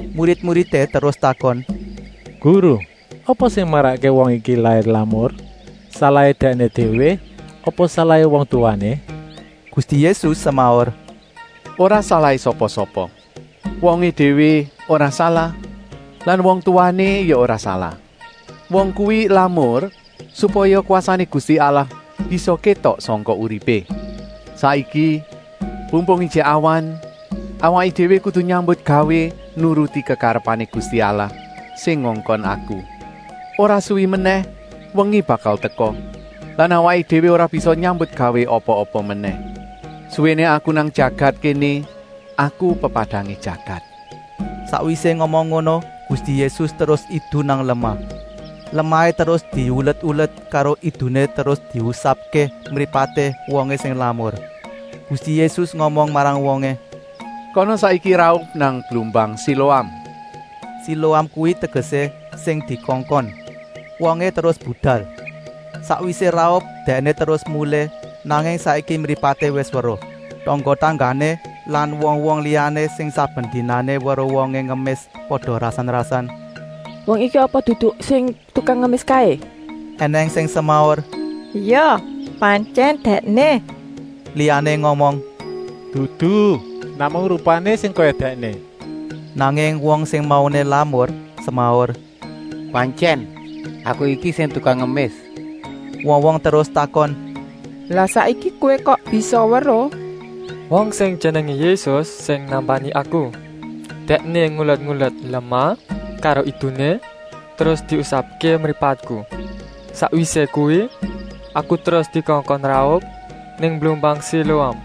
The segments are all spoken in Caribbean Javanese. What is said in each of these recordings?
Murid-muridé terus takon: “Guru, apa sing marakké wong iki lair lamur: salahé dèkné déwé apa salahé wong tuwané?” Gusti Yésus semaur: “Ora salahé sapa-sapa! Wongé déwé ora salah lan wong tuwané ya ora salah. Wong kuwi lamur supaya kwasané Gusti Allah bisa kétok sangka uripé. Saiki pumpung ijik awan awaké déwé kudu nyambutgawé nuruti kekarepané Gusti Allah sing ngongkon Aku. Ora suwi menèh wengi bakal teka lan awaké déwé ora bisa nyambutgawé apa-apa menèh. Suwéné Aku nang jagat kéné Aku pepadangé jagat.” Sakwisé ngomong ngono Gusti Yésus terus idu nang lemah. Lemahé terus diulet-ulet karo iduné terus diusapké mripaté wongé sing lamur. Gusti Yésus ngomong marang wongé: “Kana saiki raup nang blumbang Siloam!” (Siloam kuwi tegesé: sing dikongkon.) Wongé terus budal. Sakwisé raup dèkné terus mulih, nanging saiki mripaté wis weruh. Tangga-tanggané lan wong-wong liyané sing saben dinané weruh wongé ngemis pada rasan-rasan: “Wong iki apa dudu sing tukang ngemis kaé?” Enèng sing semaur: “Ya, pantyèn dèkné!” Liyané ngomong: “Dudu, namung rupané sing kaya dèkné.” Nanging wong sing mauné lamur semaur: “Pantyèn aku iki sing tukang ngemis!” Wong-wong terus takon: “Lah saiki kowé kok bisa weruh?” “Wong sing jenengé Yésus sing nambani aku. Dèkné ngulet-ulet lemah karo iduné terus diusapké mripatku. Sakwisé kuwi aku terus dikongkon raup nang blumbang Siloam.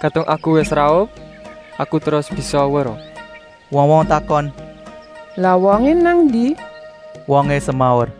Kadung aku wis raup aku terus bisa weruh.” Wong-wong takon: “Lah wongé nang endi?” “Embuh ya,” wongé semaur.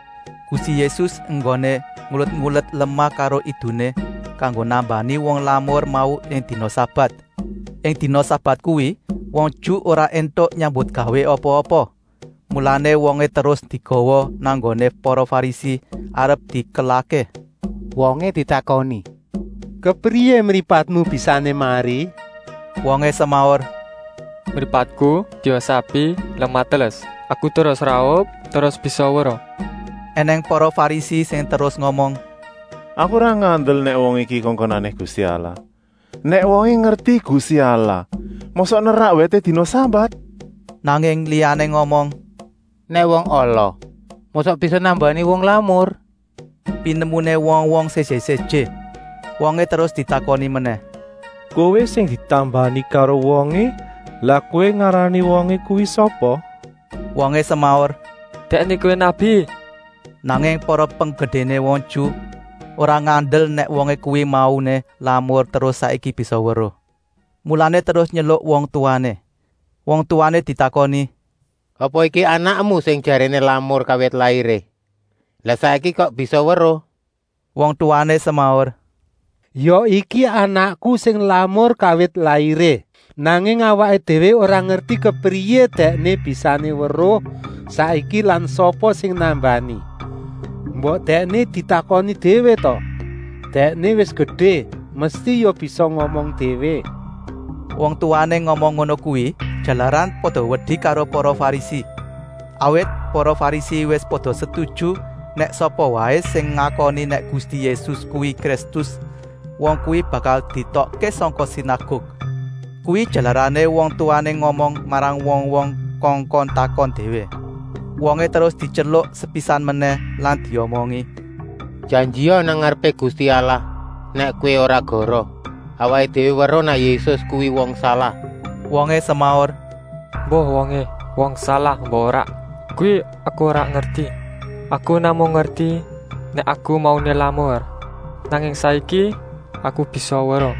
Gusti Yésus enggoné ngulet-ulet lemah karo iduné kanggo nambani wong lamur mau ing dina sabat. Ing dina sabat kuwi wong Ju ora éntuk nyambutgawé apa-apa, mulané wongé terus digawa nang nggoné para Farisi arep dikelahké. Wongé ditakoni: “Kepriyé mripatmu bisané mari?” Wongé semaur: “Mripatku diusapi lemah teles, aku terus raup terus bisa weruh!” Enèng para Farisi sing terus ngomong: “Aku ora ngandel nèk wong iki kongkonané Gusti Allah. Nèk wongé ngerti Gusti Allah mosok nerak wèté dina sabat?” Nanging liyané ngomong: “Nèk wong ala mosok bisa nambani wong lamur?” Pinemuné wong-wong séjé-séjé. Wongé terus ditakoni menèh: “Kowé sing ditambani karo wongé, lah kowé ngarani wongé kuwi sapa?” “Dèkné kuwi nabi,” wongé semaur. Nanging para penggedéné wong Ju ora ngandel nèk wongé kuwi mauné lamur terus saiki bisa weruh. Mulané terus nyeluk wong tuwané. Wong tuwané ditakoni: “Apa iki anakmu sing jaréné lamur kawit lairé. Lah saiki kok bisa weruh?” Wong tuwané semaur: “Ya, iki anakku sing lamur kawit lairé! Nanging awaké déwé ora ngerti kepriyé dèkné bisané weruh saiki lan sapa sing nambani. Mbok dèkné ditakoni déwé ta. Dèkné wis gedé, mesti ya bisa ngomong déwé!” Wong tuwané ngomong ngono kuwi, jalaran pada wedi karo para Farisi. Awit para Farisi wis pada setuju nèk sapa waé sing ngakoni nèk Gusti Yésus kuwi Kristus, wong kuwi bakal dietokké sangka sinaguk. Kuwi jalarané wong tuwané ngomong marang wong-wong kongkon takon déwé. Wongé terus dityeluk sepisan menèh lan diomongi: “Janjia nang ngarepé Gusti Allah nèk kowé ora goroh. Awaké déwé weruh nèk Yésus kuwi wong salah.” Wongé semaur: “Embuh wongé wong salah embuh ora, kuwi aku ora ngerti. Aku namung ngerti nèk aku mauné lamur, nanging saiki aku bisa weruh!”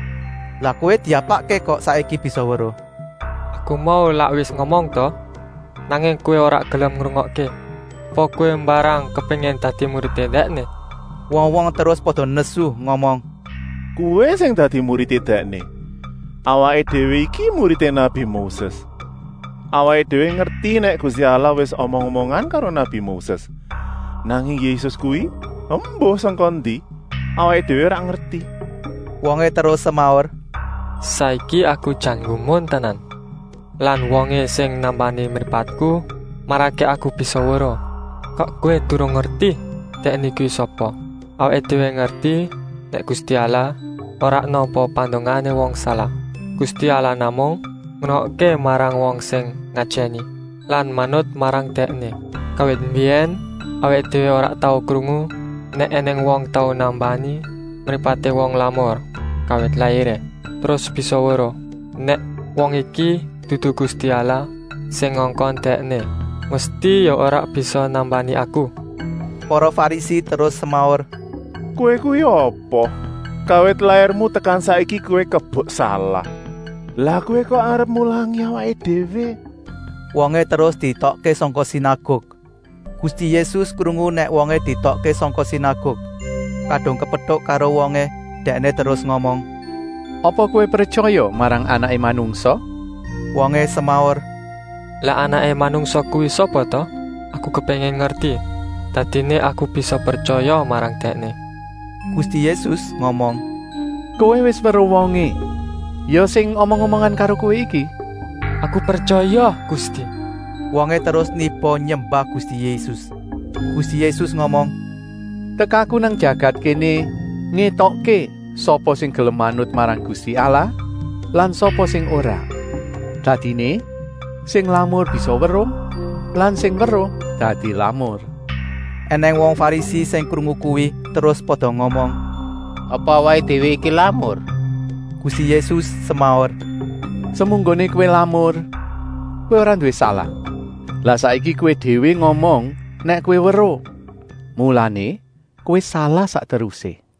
“Lah kowé diapakké kok saiki bisa weruh?” “Aku mau lak wis ngomong ta, nanging kowé ora gelem ngrungokké. Apa kowé mbarang kepéngin dadi muridé Dèkné!” Wong-wong terus pada nesu ngomong: “Kowé sing dadi muridé Dèkné. Awaké déwé iki muridé nabi Moses. Awaké déwé ngerti nèk Gusti Allah wis omong-omongan karo nabi Moses, nanging Yésus kuwi embuh sangka ngendi, awaké déwé ora ngerti.” Wongé terus semaur: “Saiki aku jan nggumun tenan. Lah wongé sing nambani mripatku marakké aku bisa weruh kok kowé durung ngerti Dèkné kuwi sapa? Awaké déwé ngerti nèk Gusti Allah ora nampa pandongané wong salah. Gusti Allah namung ngrungokké marang wong sing ngajèni lan manut marang Dèkné. Kawit mbiyèn awaké déwé ora tau krungu nèk ènèng wong tau nambani mripaté wong lamur kawit lairé, terus bisa weruh. Nèk wong iki dudu Gusti Allah sing ngongkon Dèkné mesti ya ora bisa nambani aku?” Para Farisi terus semaur: “Kowé kuwi apa? Kawit lairmu tekan saiki kowé kebek salah. Lah kowé kok arep mulangi awaké déwé!” Wongé terus dietokké sangka sinaguk. Gusti Yésus krungu nèk wongé dietokké sangka sinaguk. Kadung kepetuk karo wongé Dèkné terus ngomong: “Apa kowé pretyaya marang Anaké Manungsa?” Wongé semaur: “Lah Anaké Manungsa kuwi sapa ta? Aku kepéngin ngerti, dadiné aku bisa pretyaya marang Dèkné.” Gusti Yésus ngomong: “Kowé wis weruh wongé, ya sing omong-omongan karo kowé iki!” “Aku pretyaya, Gusti!” Wongé terus niba nyembah Gusti Yésus. Gusti Yésus ngomong: “Tekaku nang jagat kéné ngétokké sapa sing gelem manut marang Gusti Allah lan sapa sing ora! Dadiné, sing lamur bisa weruh lan sing weruh dadi lamur.” Enèng wong Farisi sing krungu kuwi terus pada ngomong: “Apa awaké déwé iki lamur?” Gusti Yésus semaur: “Semunggoné kowé lamur, kowé ora nduwé salah. Lah saiki kowé déwé ngomong nèk kowé weruh, mulané kowé salah sak terusé!”